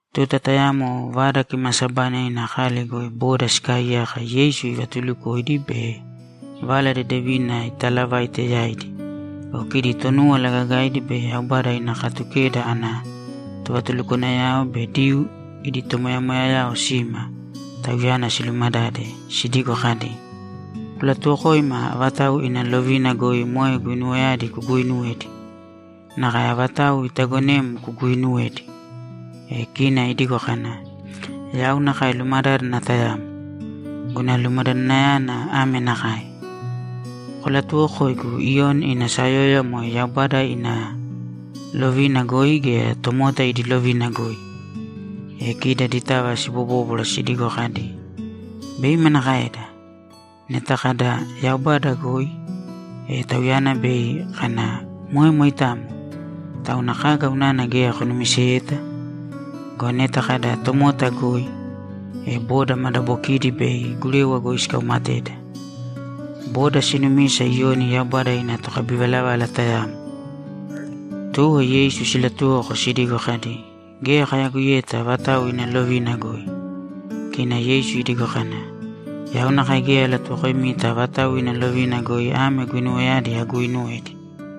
Tuta tayamo Vada Kimaasabaina ina kali goi boda sikaaiyaka Yeisu ivatuulukoidi be Vala Dedevina itaalavaite yaidi go, kidi Tonúwala Gagaidi be Yaubada ina Katukeda ana tovatulukwanayao be Diyuu idi tomoyamoyayao sima Tauyana silumadade sidigo kadi, ‘Kulatuwokōima avatau ina lovina goi moe guinuwayadi kuguuinuwedi? Nakae avatau itaagonem kuguuinuwedi?’ E kina idigo kana, ‘Yau nakae lumadádana tayamo. Guna lumadadanayana ame nakae: Kolatuwokōigu Iyoni ina sayóyova moe Yaubada ina lovina goi gea tomota idi lovina goi?’ E kidi aditava sibobóbwara sidigo kadi, ‘Bei manakaeda? Neta kada, “Yaubada goi”, e Tauyana bei kana, “Moe moitamo! Tauna kaga unana geya konumiseyeta?” Go neta kada, “Tomota goi”, e boda madabokidi bei gurewa goi sikaumateda. Boda sinumisa Iyoni Yaubada ina tokabivalavala tayamo.’ Tuwo Yeisu silatuwoko sidigo kadi, ‘Geya kayagoiyeta avatau ina lovina goi.’ Kina Yeisu idigo kana, ‘Yau nakae geya alatuwokoimita avatau ina lovina goi ame guinuwayadi aguuinuwedi.’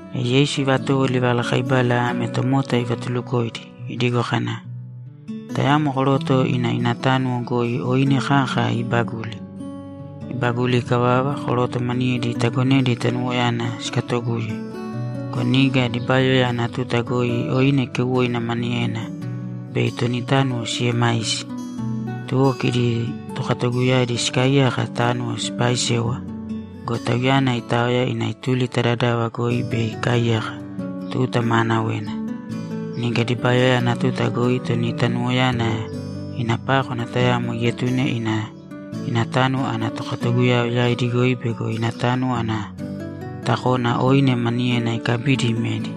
E Yeisu ivatowo livalakaibala ame tomota ivatulukoidi, idigo kana, ‘Tayamo koroto ina ina tánuwo goi oine kaka ibaguli. Ibaguli ikavava, koroto maniyedi itagonedi tanuwoyana sikatoguye go, niga dibayoya ana tuta goi oine keuwoina maniyena bei toni tánuwo siemaisi. Tuwo kidi tokatoguyadi sikaaiyaka tánuwo sipaaisewa go, tauyana itaoya ina ituli ta dadava goi bei ikaaiyaka tuta maanawena. Niga dibayoya ana tuta goi toni tanuwoyana ina pákwana tayamo ietune ina ina tánuwo ana tokatoguyao yaidi goi bego ina tánuwo ana takona oine maniyena ikabidi imedi.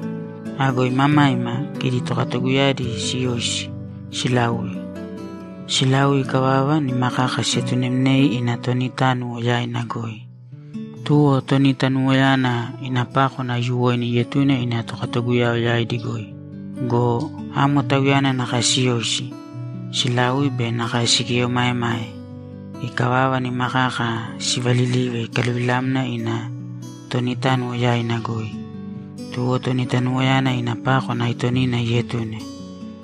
Ago imamaima, kidi tokatoguyadi siyoisi, silaui. Silaui ikavava, nima kaka sietunemnei ina toni tánuwo yaina goi. Tuwo toni tanuwoyana ina pákwana aiyuwoina ietune ina tokatoguyao yaidi goi go, amo tauyana nakae siyoisi, silaui be nakae sigieomaemae. Ikavava, nima kaka sivalilive ikaluvilamna ina toni tánuwo yaina goi. Tuwo toni tanuwoyana ina pákwana aitonina ietune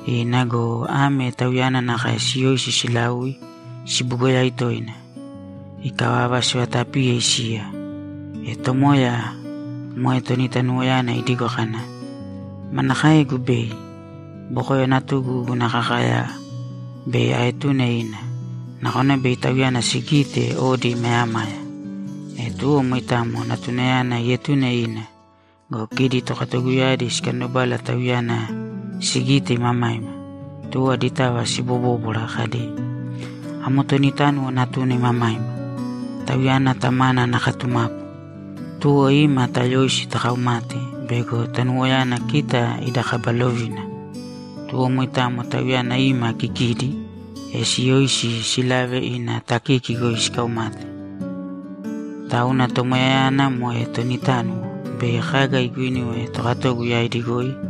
ina go, ame tauyana nakae siyoisi silaui sibugoyai toina. Ikavava, sivatapiye isiya. E tomoya, moe toni tanuwoyana, idigo kana, “Manakaegu bei? Bokoyo natugu guna kakaya bei aetune ina. Nakona bei tauyana sigite odi imayamaya.” E tuwo moitamo natunayana ietune ina go, kidi tokatoguyadi sikandobala tauyana sigite imamaima. Tuwo aditava sibobóbwara kadi, “Amo toni tánuwo natuna imamaima. Tauyana tamana ana katumapu. Tuwo ima, tayōisi takaumāte bego tanuwoyana kita ida kaba lovina.” Tuwo moitamo tauyana ima kikidi, e siyoisi silave ina takiki goi sikaumate. Tauna tomoyayana, moe toni tánuwo, bei kaga iguinuwe tokatogu yaidi goi?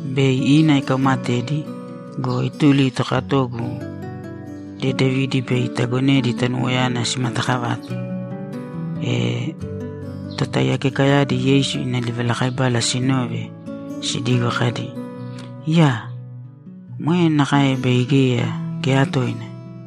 Bei ina ikaumatedi go, ituli ta tokatogu dedevidi bei itagonedi tanuwoyana simatakavate.’ E totaiyakekayadi Yeisu ina livalakaibala sinove, sidigo kadi, ‘Iyaa! Moe nakae bei geya, geya toina!’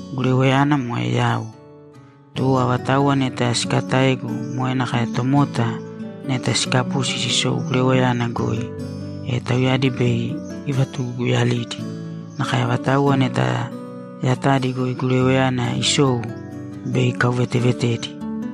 Gurewayana moe yau. Tuwo avatauwa neta sikataegu moe nakae tomota neta sikapusi sisou gurewayana goi, e tauyadi bei ivatuguguyalidi. Nakae avatauwa neta yatadi goi gurewayana isou, bei ikauvetevetedi.’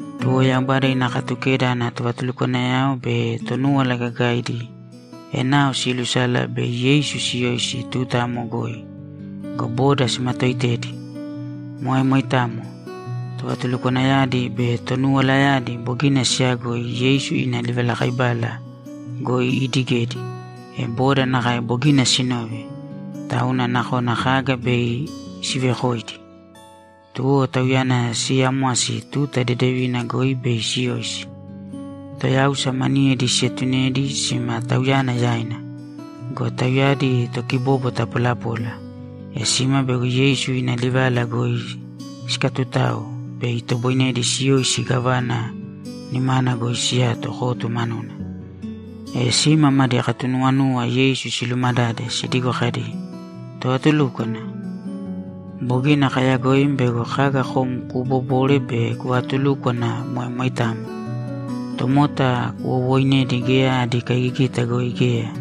Tuwo Yaubada ina Katukeda ana tovatulukwanayao be Tonúwala Gagaidi enao siilusala bei Yeisu siyoisi tuta amo goi go, boda simatooitedi. Moe moitamo. Tovatulukwanayadi be tonuwalayadi bogina siiyagoi Yeisu ina livalakaibala goi iidigedi, e boda nakae bogina sinove, tauna nakona kaga bei sivekoidi. Tuwo Tauyana siiyamwasi tuta dedevina goi bei siyoisi. Toyáusa maniyedi sietunedi sima Tauyana yaina. Go tauyadi tokibóbwata polapola, e sima bego Yeisu ina livala goi sikatutao bei itoboinedi siyoisi gávana nimana goi siyato kotu manuna. E sima madi katunuwanuwa Yeisu silumadade, sidigo kadi, ‘Tovatulúkwana, bogina kayagoim bego kaga kom kubobobore be kuvaatulúkwana moe moitamo. Tomota kuwowooinedi geya adi kaigigita goi geya,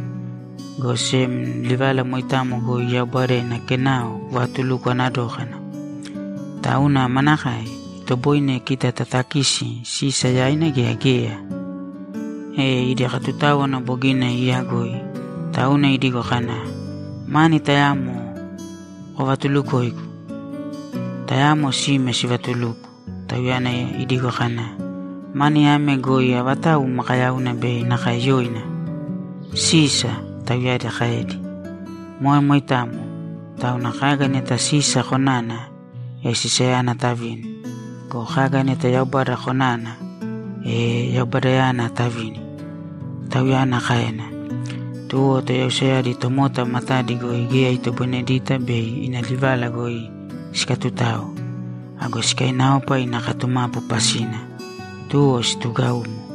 go sem livala moitamo goi Yaubada ina kenao kuvatulukwana dókana. Tauna manakae? Itoboine kita tatakisi Sisa yaina gea geya?’ E idi katutáwana bogina iiyagoi, tauna idigo kana, ‘Mani tayamo kovatulukōigu.’ Tayamo sime sivatuluko, Tauyana idigo kana, ‘Mani ame goi avatau makayauna be nakae yoina?’ ‘Sisa’, tauyadi kaedi. ‘Moe moitamo. Tauna kaga neta Sisa konana, e Sisayana tavīni go, kaga neta Yaubada konana, e Yaubadayana tavīni’, Tauyana kaena. Tuwo toyausayadi tomota matadi goi geya itoboinedita bei ina livala goi sikatutao. Ago sikainaopa ina katumapu pasina, tuwo situgaumo.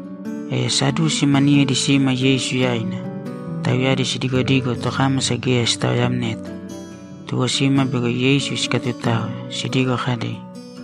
E Sadusi maniyedi sima Yeisu yaina. Tauyadi sidigodigo tokámasa geya sitaoyamneta. Tuwo sima bego Yeisu sikatutao sidigo kadi,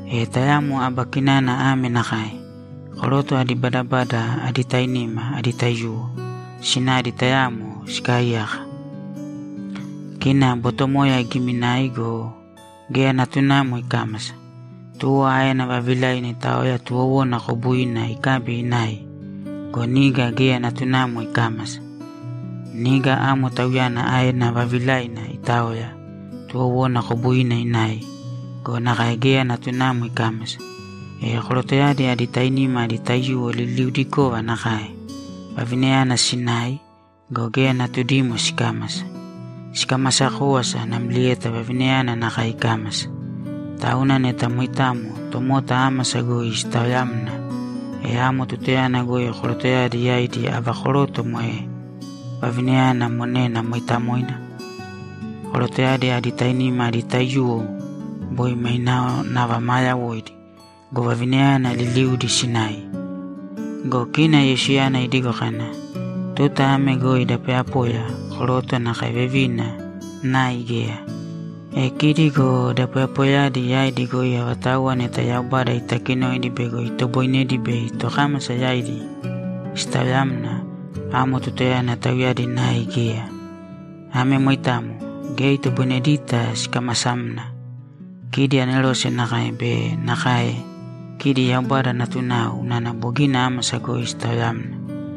E tayamo aba kinana ame nakae: Koroto adi badabada adi tainima adi taiyuwo sinadi tayamo sikaaiyaka. Kina botomoya igiminai go, geya natunamo ikámasa. Tuwo aena vavilaina itaoya tuwowona kobuina ikabi inai go, niga geya natunamo ikámasa. Niga amo tauyana aena vavilaina itaoya, tuwowona kobuina inai go, nakae geya natunamo ikámasa. E korotoyadi adi tainima adi taiyuwo liliudikova nakae. Vavinayana sinai go, geya natudimo sikámasa. Sikamasa kówasa namlieta vavinayana nakae ikámasa. Tauna neta moitamo tomota ámasa goi sitaoyamna, e amo tutayana goi korotoyadi yaidi ava koroto moe vavina monena mooitamoina? Korotoyadi adi tainima adi taiyuwo boi mainao nava maa yawoidi go, vavinayana liliudi sinai.’ Go kina Yeisuyana idigo kana, ‘Tuta ame goi da poyapoya, koroto nakae vevina, nai geya. E kidi go da poyapoyayadi yaidi goi avatauwa neta Yaubada itakinoidi bego itoboinedi bei tokámasa yaidi sitaoyamna, amo tutayana tauyadi nai geya. Ame moitamo. Geya itoboinedita sikamasamna. Kidi anerose nakae be nakae kidi Yaubada natunao unana bogina ámasa goi sitaoyamna.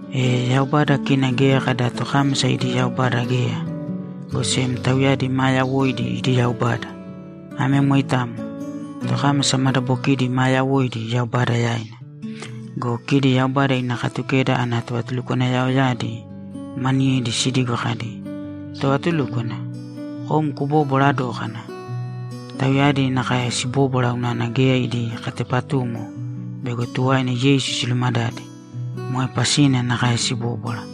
E Yaubada kina geya kada tokámasa idi Yaubada geya, go sem tauyadi maa yawoidi idi Yaubada. Ame moitamo. Tokámasa madabokidi maa yawoidi Yaubada yaina.’ Go kidi Yaubada ina Katukeda ana tovatulukwanayaoyadi maniyedi sidigo kadi, ‘Tovatulúkwana, kom kubobwara dókana!’ Tauyadi nakae sibóbwara unana geya idi katepatumo bego tuwaina Yeisu silumadade. Moe pasina nakae sibóbwara.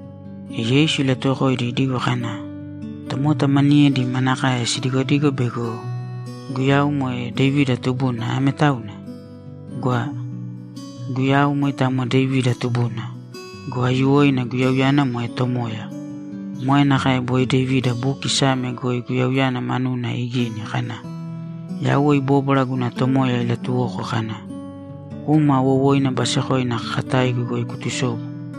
E Yeisu ilatuwokoidi idigo kana, ‘Tomota maniyedi manakae sidigodigo bego Guyau moe Devida tubuna ame tauna? Gwa! Guyau moitamo Devida tubuna go, aiyuwoina Guyauyana moe Tomoya. Moe nakae boi Devida buki Same goi Guyauyana manuna igini kana, “Yauwe ibóbwara guna tomoya ilatuwoko kana, ‘Kūma wowoina basekoina kakataigu goi kutusōbu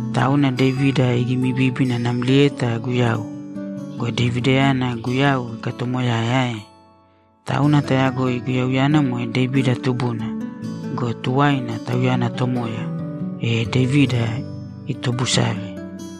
Tauna Devida igimibíbina namlieta Guyau go, Devidayana Guyau ikatoomoyae ae? Tauna tayagoi Guyauyana moe Devida tubuna go, tuwaina, Tauyana Tomoya, e Devida itobusave!’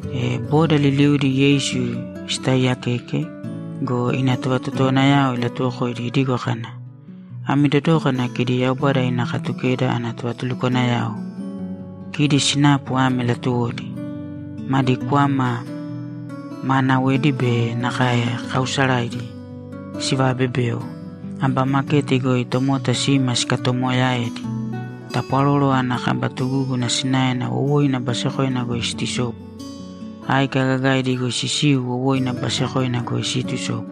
E boda liliudi Yeisu sitaaiyakeke go, ina tovatotowanayao ilatuwokoidi idigo kana, ‘Ami dodōkana kidi Yaubada ina Katukeda ana tovatulukwanayao. Kidi sinapu ame latuwodi: Madi kwama maanawedi be nakae kaausaraidi sivaabebeo. Aba maketi goi tomota sima sikatoomoyaedi. Tapwaroro ana kaba tugúguna sinaena wowoina basekoina goi siitusobu. Áika gagaidi goi sisiu wowoina basekoina goi siitusobu.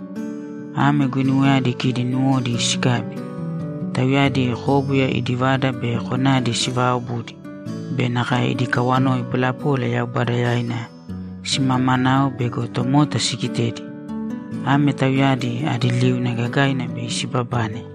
Ame guinuwayadi kidi nuwodi sikabi. Tauyadi kóbuya idi vada be konadi sivaaobudi be nakae idi kawanoi polapola Yaubada yaina simamanao bego tomota sigitedi. Ame tauyadi adi liuna gagaina bei sibabane.’